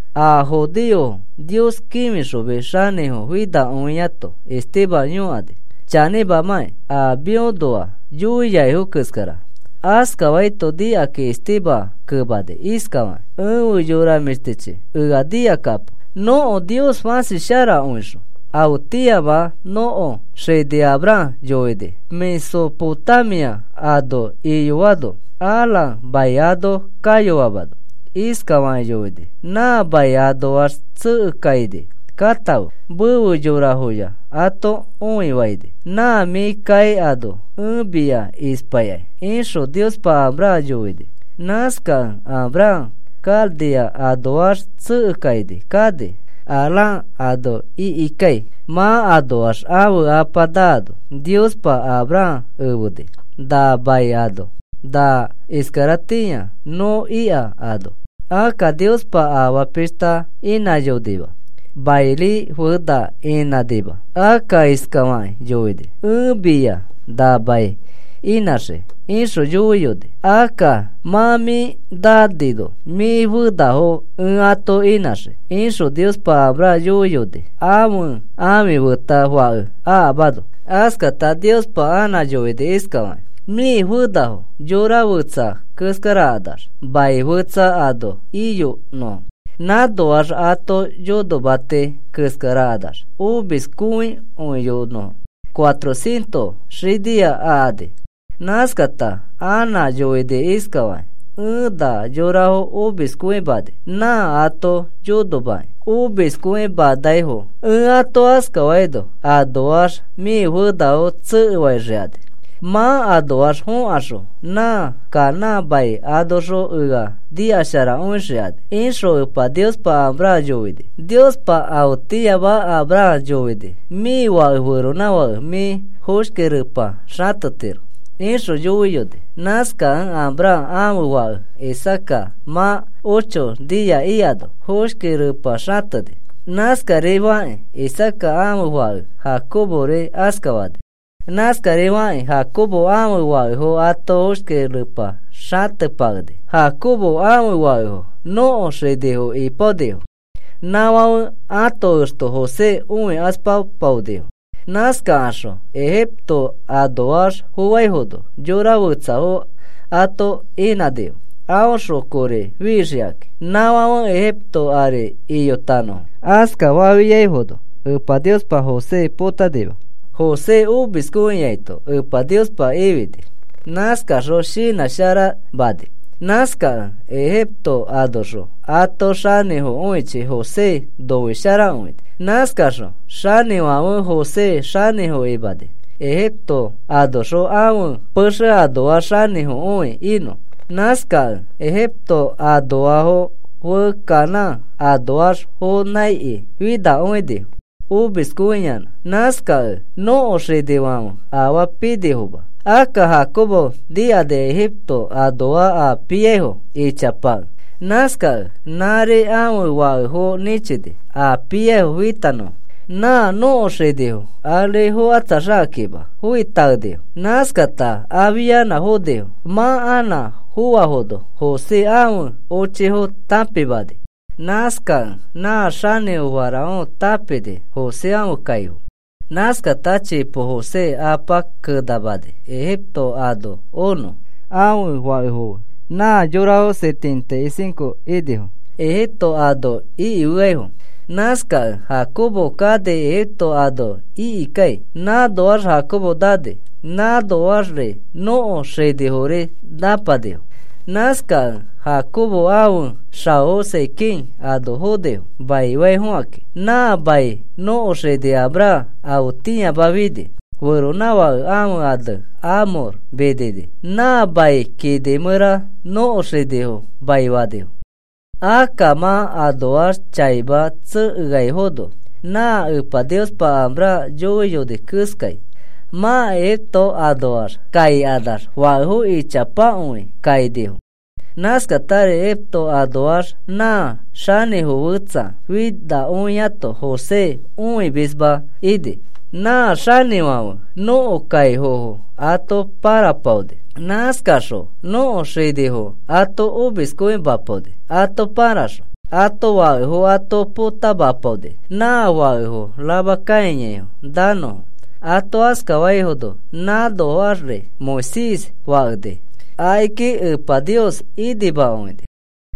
A judeofo Nios kĩfixomis xanĩfo finakõiato Esteban yõkani: “¿Chanĩmamakĩ a mĩõnoa yoiaifo keskara?” Askafaito nikakĩ Esteban kemani iskafakĩ: “Efe yora mĩshtichi, ea nikakapo. Nõko Nios fãsi sharakõixõ afetĩama nõko xini Abraham yoini, Mesopotamia ano iyoano, Harán mai ano kayoamano. Iskafakĩ yoini: ‘Na mai anoax tsekekaini katãfe, mefe yorafoya ato õifaini. Nã mĩ kai ano ẽ mia ispaikai,’ ixõ Niospa Abraham yoini. Nãskakẽ Abraham Caldea anoax tsekekaini kani, Harán ano ikikai. Mã anoax ãfe apa naano Niospa Abraham efeni na mai ano, na iskaratĩa nõ ika ano. Akka Niospa afaa pishta inãyonima. Mairi fena inãnima. Akka iskafakĩ yoini: ‘Ẽ mia na mai inãxii,’ ixõ yoiyoni. ‘Akka mã mĩ nanino mĩ fenafo ẽ ato inãxii,’ ixõ Niospa Abraham yoiyoni ãfe ãfi feta fake akamano. Askata Niospa anã yoini iskafakĩ: ‘Mĩ fenafo yora fetsa keskarakanax mai fetsa ano iyonõfo. Nãnoax ãto yonomati keskarakanax omiskõikõiyonõfo cuatrocientos xinia akani.’ Nãskata anã yoini iskafakĩ: ‘Ẽ na yorafo omiskõimani, nã ato yonomakĩ omiskõimanaifo. Ẽ ato askafaino anoax mĩ fenafo tsekefaixikani. Mã anoax fokaxõ nã Canaán mai anoxõ ea nikasharakõixikani,’ ixõ Epa Niospa Abraham yoini. Niospa afetĩama Abraham yoini: ‘Mĩ fake feronãfake mĩ foshki repa xatetiro,’ ixõ yoiyoni. Nãskakẽ Abraham ãfe fake Isaaca mã ocho nia ikano foshki repa xateni. Nãskarifakĩ Isaaca ãfe fake Jacobori askafani. Nãskarifakĩ Jacobo ãfe fakefo ato foshki repa xatepakeni. “Jacobo ãfe fakefo nõko xinifo ipaonifo, nãfãfe ãto exto José õikaspapaonifo. Nãskakaxõ Egipto anoax foaifono yora fetsafo ato inãnifo aõxõ kori fixikakĩ nãfãfe Egipto ari iyotanõfo. Askafafiaifono Epa Niospa José potanima. José omiskõiaito Epa Niospa ifini. Nãskaxõ shinãsharamani. Nãskakẽ Egipto anoxõ ato xanĩfokõichi José noisharakõini. Nãskaxõ xanĩfãfe José xanĩfo imani, Egipto anoxõ ãfe pexe anoax xanĩfokõi inõ. “Nãskakẽ Ejipto anoafo fe Canaán anoax fonãiki finakõinifo omiskõiyanã. Nãskakẽ nõko xinifãfe afaa pinifoma. Akka Jacobo nikani Egipto anoa a piaifo ichapakẽ. Nãskakẽ nãri ãfe fakefo nĩchini a piaifo fitanõfo, nã nõko xinifo. Ari fokatsaxakakĩma foitaenifo. Nãskakata afianã fonifo. Mã anã foafono José ãfe ochifo tãpimani. Nãskakẽ nã xanĩfo Faraón tãpini José ãfe kaifo. Nãskata chipo José apa kenamani Egipto ano onõ ãfe fakefo fe. Nã yorafo setenta y cinco inifo Egipto ano ikifeaifo. Nãskakẽ Jacobo kani Egipto ano ikikai. Nãnoax Jacobo nani, nãnoaxri nõko xinifori nãpanifo. Nãskakẽ Jacobo ãfe xaofo Siquem ano fonifo maifaifokakĩ. Nã mai nõko xini Abraham afetĩama fini, feronãfake ãfe ane Hamor minini. Nã mai kini mẽra nõko xinifo maifanifo. “Akka mã anoax chaima tsekeaifono nã Epa Niospa Abraham yoiyoni keskai, mã Egipto anoax kaikanax fakefo ichapakõi kainifo. Nãskatari Egipto anoax nã xanĩfo fetsa finakõiato José õimisma ini. Nã xanĩfãfe nõko kaifofo ato pãrapaoni. Nãskaxõ nõko xinifo ato omiskõimapaoni. Ato pãraxõ ãto fakefo ato potamapaoni nã fake rama kãiyaifo nanõfo. Ato askafaino nãnoaxri Moisés fakeni. Akiki Epa Nios inimakõini.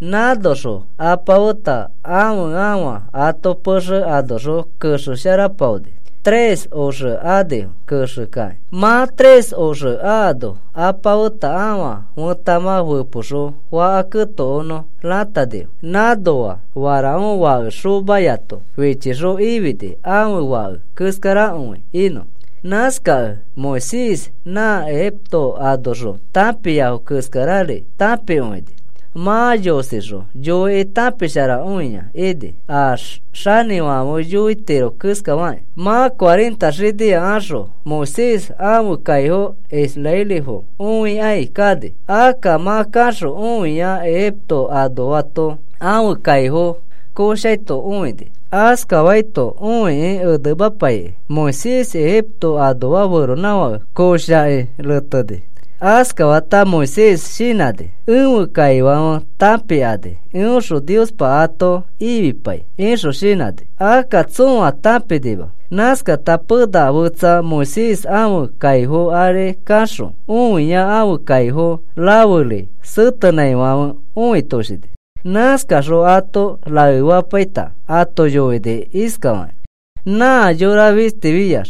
Nãnoxõ apa feta ãfe afa ato pexe anoxõ kexesharapaoni. Tres oxe anifo kexekakĩ. Mã tres oxe akano apa feta ãfa fẽtamã fepoxõ faka ketokonõ ratanifo. Nãnoa Faraón fake xomayato fichixõ ifini ãfe fake keskarakõi inõ. Nãskakẽ Moisés nã Egipto anoxõ tãpiafo keskarari tãpikõini. Mã yosixõ yoikĩ tãpisharakõia ini a xanĩfãfe yoitiro keskafakĩ. “Mã cuarenta xinia axõ Moisés ãfe kaifo israelifo õikai kani. Akka mã kaxõ õia Egipto anoato ãfe kaifo koshaito õini. Askafaito õikĩ timamapaikĩ, Moisés Egipto anoa feronãfake koshakĩ reteni. Askafata Moisés shinãni: ‘Ẽfe kaifãfe tãpikani eõxõ Niospa ato ifipai,’ ixõ shinãni. Akka tsõa tãpinima. Nãskata pena fetsa Moisés ãfe kaifo ari kaxõ õia ãfe kaifo raferi setenãifãfe õitoshini. Nãskaxõ ato raefapaita ato yoini iskafakĩ: ‘Nã yora fistifiax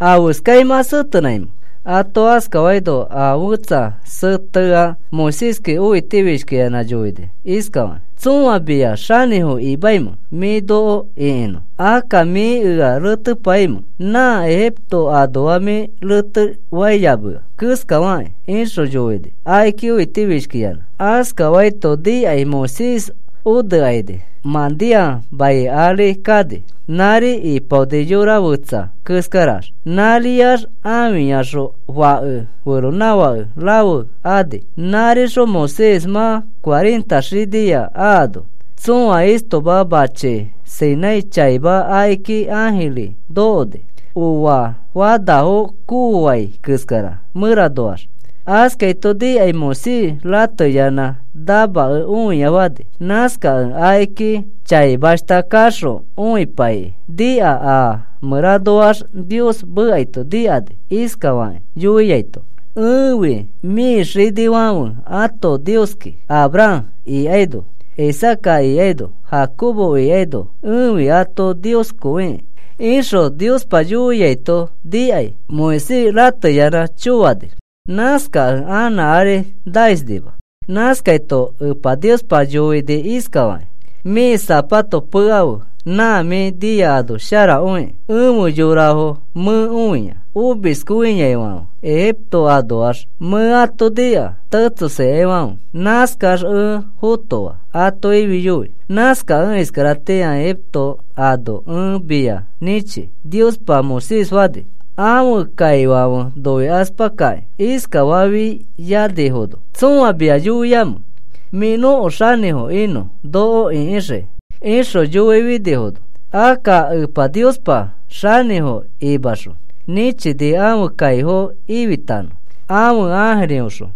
¿afeskai mã setenãimẽ?’ Ato askafaino a fẽtsa seteai Moiséski õiti fishkiyanã yoini iskafakĩ: ‘¿Tsõa mia xanĩfo imamẽ mĩ noko ĩkinõ? ¿Akka mĩ ea retepaimẽ nã Egipto anoa mĩ retefaiyamea keskafakĩ?’ ixõ yoini akiki õiti fishkiyanã. Askafaito nikai Moisés onekaini Madián mai ari kani. Nãri ipaoni yora fetsa keskarax. Nãriax ãfiyaxõ fake feronãfake rafe ani. “Nãrixõ Moisés mã cuarenta xinia akano, tsõa istoma machi Sinai chaima akiki ãjiri nokoni, oa fanafo kooai keskara mẽranoax. Askaito nikai Moisés rateyanã namakẽ õia fani. Nãskakẽ akiki chaimashta kaxõ õipaikĩ nika a mẽranoax Nios mekaito nikani iskafakĩ yoiaito, ‘Ẽfi mĩ xinifãfe ato Nioski. Abraham ikaino Isaaca ikaino Jacobo ikaino ẽfi ãto Nioskõikĩ,’ ixõ Niospa yoiaito nikai Moisés rateyanã choani. Nãskakẽ anã ari naisnima. Nãskaito Epa Niospa yoini iskafakĩ: ‘Mĩ zapato pekafe, nã mĩ nia ano sharakõikĩ. Efe yorafo mẽ õia omiskõiaifãfe Egipto anoax. Mẽ ato nika tetsosikaifãfe. Nãskax ẽ fotoa ato ifiyoi. Nãskakẽ iskaratĩa Egipto ano ẽ mia nĩchi,’ Niospa Moisés fani. “Ãfe kaifãfe noikaspakakĩ iskafafianifono: ‘¿Tsõa mia yoiamẽ mĩ nõko xanĩfo inõ noko ĩkixikĩ?’ ixõ yoifinifono. Akka Epa Niospa xanĩfo imaxõ nĩchini ãfe kaifo ifitanõ, ãfe ãjiriõxõ.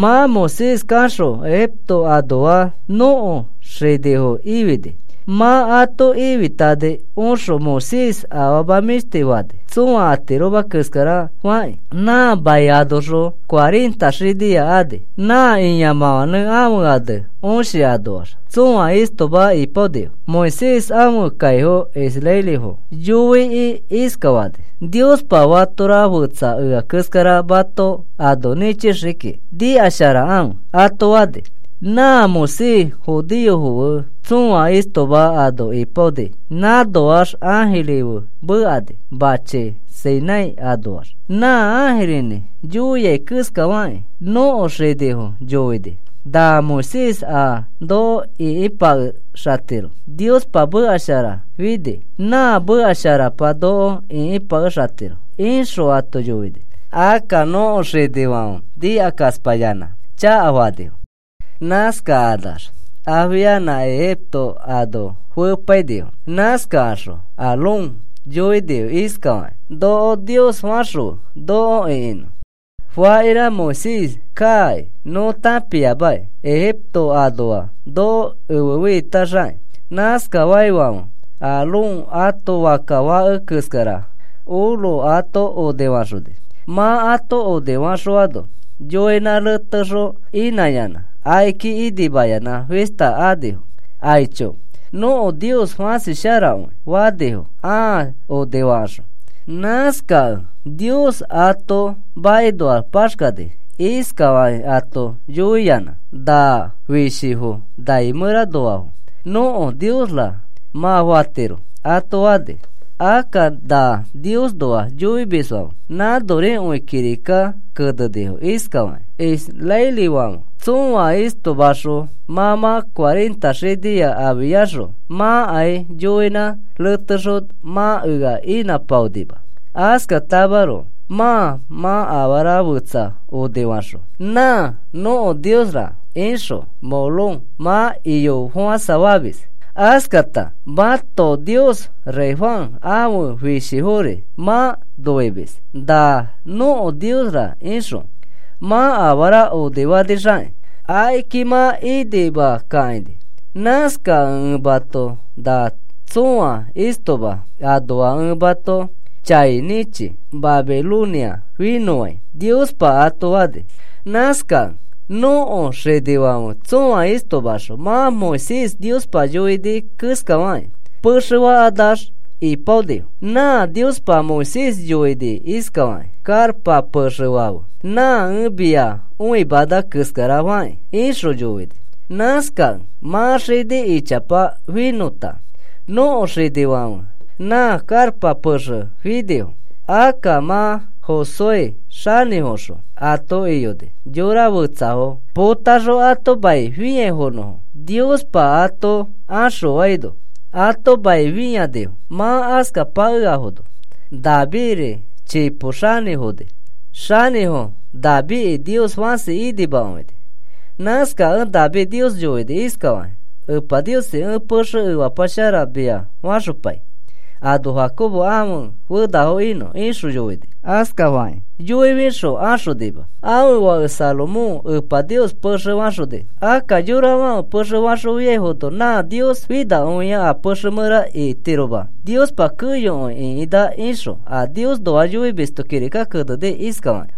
Mã Moisés kaxõ Egipto anoa nõko xinifo ifini. Mã ato ifitani oxõ Moisés afama mĩshti fani tsõa atiroma keskara fakĩ. Nã mai anoxõ cuarenta xinia ani. Nã ĩamãfãnẽ ãfe ane Õshi anoax tsõa istoma ipaonifo. Moisés ãfe kaifo israelifo yoikĩ iskafani: ‘Niospa fatora fetsa ea keskara mato ano nĩchixii kiki. Nikasharakãfe,’ ato fani. Nã Moisés judeofo fe tsõa istoma ano ipaoni. Nãnoax ãjiri fe mekani machi Sinai anoax, nã ãjirinĩ yoia keskafakĩ nõko xinifo yoini. Nã Moisés a noko ĩkipakexatiro Niospa meka shara fini, nã meka sharapa noko ĩkipakexatiro ixõ ato yoini. “Akka nõko xinifãfe nikakaspayanã chakafanifo. Nãskakanax afianã Egipto ano fepainifo. Nãskakaxõ Aarón yoinifo iskafakakĩ: ‘Noko nios faxõfe noko ĩkinõ. Fakira Moisés kaaki nõ tãpiamaki, Egipto anoa noko efefiitaxakĩ.’ Nãskafaifãfe Aarón ato fakka fake keskara oro ato onifaxoni. Mã ato onifaxõano yoinã retexõ inãyanã akiki inimayanã fista axonifo. ‘Aicho, nõko nios fasi sharakõi,’ fanifo ãa onifakaxõ. Nãskakẽ Nios ato makinoax paxkani iskafakĩ ato yoiyanã: ‘Na fishifo nai mẽranoafo nõko niosra mã fatiro,’ ato fani. Akka nã Niosnoa yoimisfãfe, nãnorikõi kirikaki kenenifo iskafakĩ: Israelifãfe tsõa istomaxõ mã mã cuarenta xinia afiaxõ mãkai yoinã retexõ mã ea inãpaonima, Askatamaroko mãa mã afara fetsa onifaxõ, ‘Nã nõko niosra,’ ixõ Moloc mã iyafofãsafamis. Askata mãto nios Refán ãfe fishifori mã noimis. Na nõko niosra ixõ mã afara onifanixakĩ, akiki mã inima kakãini. Nãskakẽ ẽ mãto na tsõa istoma anoa ẽ mato chai nĩchi, Babilonia finõfãi, Niospa ato fani. “Nãskakẽ nõko xinifãfe tsõa istomaxõ nã Moisés Niospa yoini keskafãkĩ pexe fakanax ipaonifo. Nã Niospa Moisés yoini iskafakĩ: ‘Karpa pexe fafe nã ẽ mia õimana keskara fakĩ,’ ixõ yoini. Nãskakẽ mã xini ichapa finõta nõko xinifãfe nã karpa pexe finifo. Akka mã Josué xanĩfoxõ ato iyoni yora fetsafo potaxõ ato mai fĩaifonõfo. Niospa ato axõfaino ato mai fĩanifo. Mã askapakeafono Davidri chipo xanĩfoni. Xanĩfo Davidki Nios fãsi inimakõini. Nãskakẽ David Nios yoini iskafakĩ: ‘Epa Niosi, ẽ pexe efapa shara mia faxopai ano Jacobo ãfe fenafo inõ,’ ixõ yoini. Askafakĩ yoifixõ axonima, ãfe fake Salomón Epa Nios pexe faxoni. Akka yorafãfe pexe faxõfiafono nã Nios finakõia a pexe mẽra itiroma. Niospa keyokõi ĩkinã ixõ a Niosnoa yoimisto kirika keneni iskafakĩ: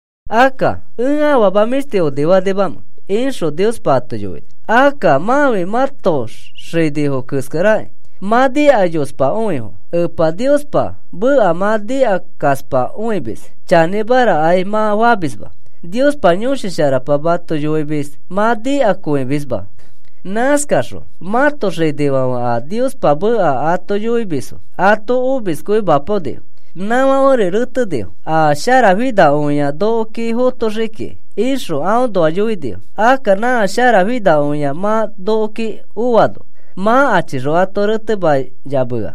Akka, ¿ẽ afama mĩshti onifanimamẽ? ixõ Niospa ato yoini. “Akka mãfi mãto xinifo keskarakĩ. Mã nikayospakõifo Epa Niospa meka mã nikakaspakõimis, chanĩmarakai mã famisma. Niospa Yõshi Sharapa mato yoimis mã nikakõimisma. Nãskaxõ mãto xinifãfe a Niospa meka ato yoimisfo ato omiskõimapaonifo. Nãfãferi retenifo, ‘A sharafinakõia nokoki fotoxii kiki,’ ixõ aõnoa yoinifo. Akka nã sharafinakõia mã nokoki oano, mã achixõ ato retemayamea.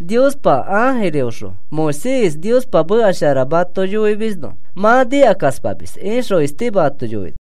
Niospa ãjirifoõxõ Moisés Niospa meka shara mato yoifimisno mã nikakaspamis,” ixõ Esteban ato yoini.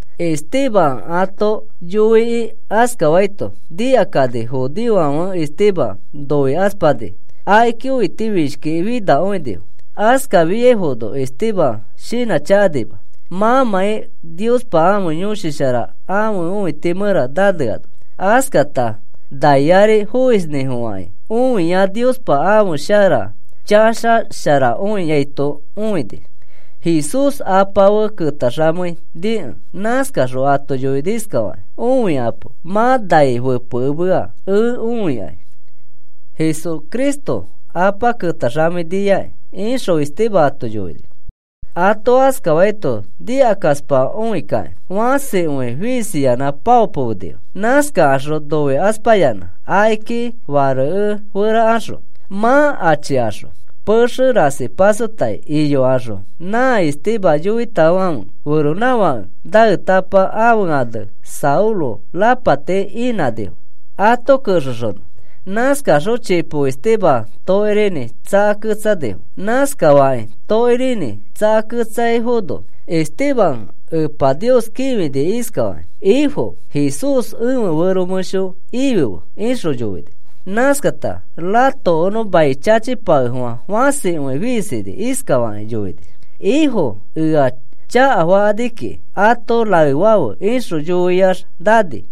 Esteban ato yoikĩ askafaito nikakani judeofãfe Esteban noikaspakani, akiki õitifishkikĩ finakõinifo. Askafiaifono Esteban shinãchakanima mãmãi Niospa ãfe Yõshi Shara ãfe õiti mẽra naneano. Askata nai ari foisnĩfofãkĩ õia Niospa ãfe shara chaxasharakõiaito õini, Jesús Apa fe ketaxamei nikẽ. Nãskaxõ ato yoini iskafakĩ: “¡Õikapo! Mã nai fepekemea ẽ õikai Jesucristo Apa ketaxamei niakĩ,” ixõ Esteban ato yoini. Ato askafaito nikakaspakõikakĩ fãsikõi fiisiyanã paopomenifo. Nãskakaxõ noikaspayanã akiki fareke ferakaxõ, mã achikaxõ pexe rasi pasotai iyokaxõ nã Esteban yõaitafãfe feronãfake naetapa ãfe ane Saulo rapati inãnifo ato kexexonõ. Nãskakaxõ chipo Esteban tokirinĩ tsakaketsanifo. Nãskafakĩ tokirinĩ tsakaketsaifono Esteban Epa Nios kĩfini iskafakĩ: “Ifo Jesús, ẽfe fẽro mẽsho ifife,” ixõ yoini. Nãskata ratokonõ mai chachipakefofã, fãsikõi fiisini. Iskafakĩ yoini: “Ifo, ea chakafakani kiki ato raefãfe,” ixõ yoiax nani.